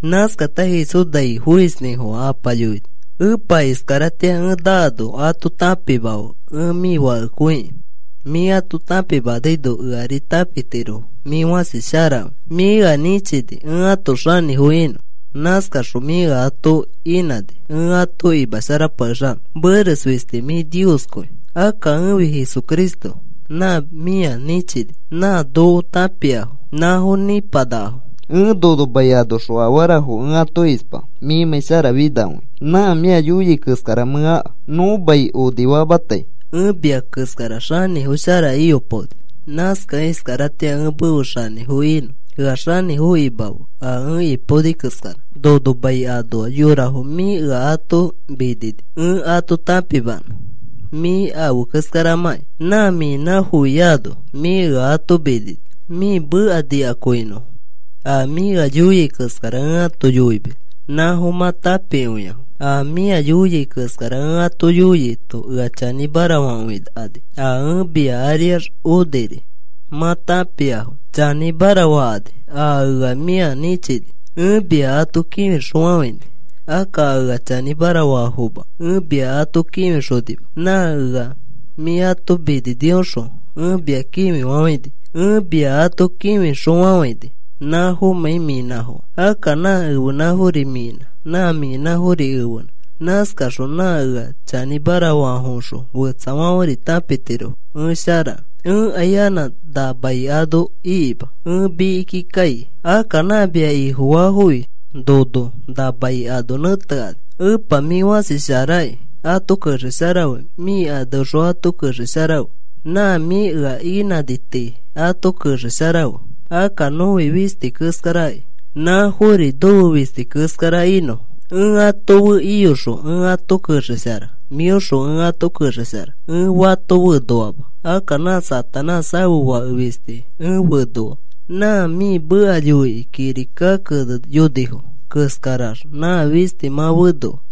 Nãskata Jesús nai foisnĩfofã Apa yoini: “Epa, iskaratĩa ẽ naano ato tãpimafe ẽ mĩ Fakekõiki. Mĩ ato tãpimanaino ẽri ato tãpimatiro mĩ fãsi sharakõi. Mĩ ea nĩchini ẽ ãto xanĩfo inõ. Nãskaxõ mĩ ea ato inãni ẽ ato imasharapakexanõ. Meres fisti mĩ Nioskõi. Akka ẽfi Jesucristo nã mĩa nĩchini. Nã noko tãpiafo nãfo nipanakafo. “Ẽ nono mai anoxõ afarafo ẽ ato ispa, mĩmãi sharafinakõikẽ. Nã mĩa yoiai keskara mẽ aka. Nõ mai onifamatai ẽ mia keskara xanĩfo shara iyopaoni. Nãskakẽ iskaratĩa ẽ mefe xanĩfo inõ ea xanĩfo imafe a ẽ ipaoni keskara. “Nono mai anoa yorafo mĩ ea ato minini ẽ ato tãpimanõ mĩ afe keskaramãki. Nã mĩnãfofiano mĩ ea ato minini. Mĩ meka nikakõinifo. A mĩ ea yoia keskara ẽ ato yoimis. Nãfo mã tãpikõiafo. A mĩa yoiai keskara ẽ ato yoiaito ea chanĩmara fakõikani. A ẽ mia ariax oniri mã tãpiafo. Chanĩmara fakani a ea mĩa nĩchini. “Ẽ mia ato kĩfixõfafãini. Akka a ea chanĩmara faafoma ẽ mia ato kĩfixonima. Nã ea mĩ ato mininiõxõ ẽ mia kĩfifafãini. Ẽ mia ato kĩfixõfafãini nãfomãi mĩnãfokẽ. Akka nã ẽfenãfori mĩnãki. Nã mĩnãfori ẽfenã. Nãskaxõ nã ea chanĩmara faafoõxõ fetsafãferi tãpitirofo ẽ sharakẽ. “Ẽkai anã na mai ano ikima. Ẽ mikiki kai. Akka nã mia Ifofaafofi nono na mai ano nẽtekani. Epa, mĩ fãsi sharaki. Ato kexesharafe. Mĩ aneõxõ ato kexesharafe. Nã mĩ ea inãni tii ato kexesharafe. Akka nõfi fisti keskaraki. Nãfori nofe fisti keskara inõfo. Ẽ ato fe iyoxõ ẽ ato kexeshara. Mĩoxõ ẽ ato kexeshara, ẽ fato fenoama. Akka nã Satanás ãfe fake fisti ẽ fenoa. Nã mĩ meka yoikĩ kirika keneyonifo keskarax nã fisti mã fenoa.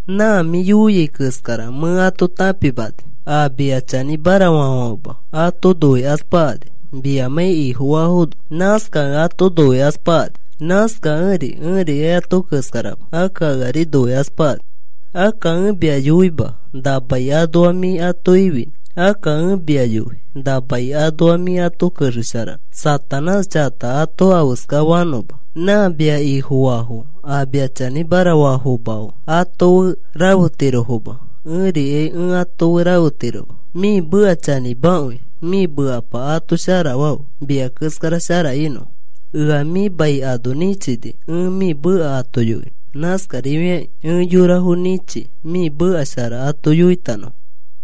Nã mĩ yoiai keskara mẽ ato tãpimani. A mia chanĩmara faafãfema ato noikaspakani, miamãi Ifofaafono. Nãskakẽ ato noikaspakani. Nãskakẽri ẽrikai ato keskarama. Akka eari noikaspakani. “Akka ẽ mia yoima na mai anoa mĩ ato ifinõ. Akka ẽ mia yoi na mai anoa mĩ ato kexesharanõ Satanás chakata ato afeska fanõma. Nã mia Ifofaafo a mia chanĩmara faafomafo fe, ato fe rafetirofoma. Ẽrikai ẽ ato fe rafetiroma. Mĩ meka chanĩmakõi. Mĩ mekapa ato sharafafe mia keskara shara inõfo. Ea mĩ mai ano nĩchini ẽ mĩ meka ato yoinõ. Nãskarifakĩ ẽ yorafo nĩchi mĩ meka shara ato yoitanõfo.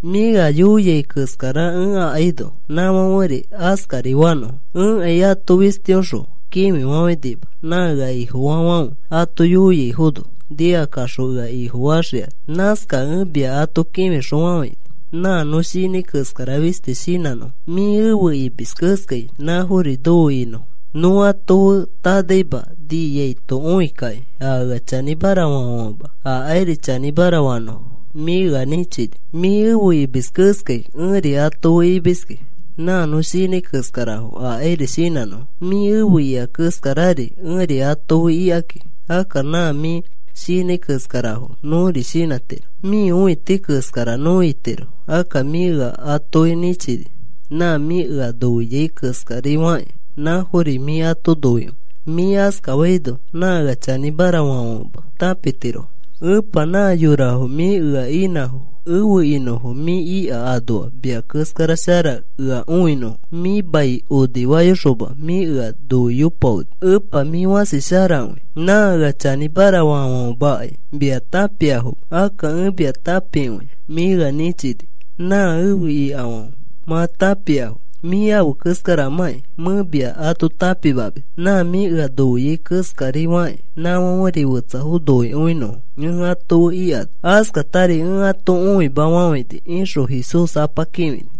Mĩa ea yoia keskara ẽ akaino nãfãferi askari fanõfo. “Ẽkai ato fistiõxõ kĩfifafãinima. Nã ea Ifofaafãfe ato yoiaifono nikakaxõ ea Ifofaxikani. Nãskakẽ ẽ mia ato kĩfixõfafãini nã nõ shinãi keskara fisti shinãnõfo. Mĩ efe imis keskai nãfori nofe inõfo. Nõ ato fe tanaima niaito õikakĩ a ea chanĩmara faafãfema akairi chanĩmara fanõfo mĩ ea nĩchini. Mĩ efe imis keskai ẽri ato fe imiski. Nã nõ shinãi keskarafo akairi shinãnõfo. Mĩ efe ika keskarari ẽri ato fe ikaki. Akka nã mĩ shinãi keskarafo nõri shinãtiro. Mĩ õiti keskara nõ itiro. Akka mĩ ea atoki nĩchini. Nã mĩ ea noiai keskari fakĩ nãfori mĩ ato noikõi. Mĩ askafaino nã ea chanĩmara faafãfema tãpitirofo. “Epa, nã yorafo mĩ ea inãfo efe inõfo mĩ ika anoa mia keskara shara ea õinõfo. Mĩ mai onifayoxoma mĩ ea noiyopaoni. Epa, mĩ fãsi sharakõi. Nã ea chanĩmara faafãfemakai mia tãpiafoma. Akka ẽ mia tãpikõia. Mĩ ea nĩchini nã efe ikafãfe mã tãpiafo. Mĩ afe keskaramãki mẽ mia ato tãpimamis nã mĩ ea noiai keskari fakĩ, nãfãferi fetsafo noikõinõfo ẽ ato fe ikano. Askatari ẽ ato õimafafãini,” ixõ Jesús Apa kĩfini.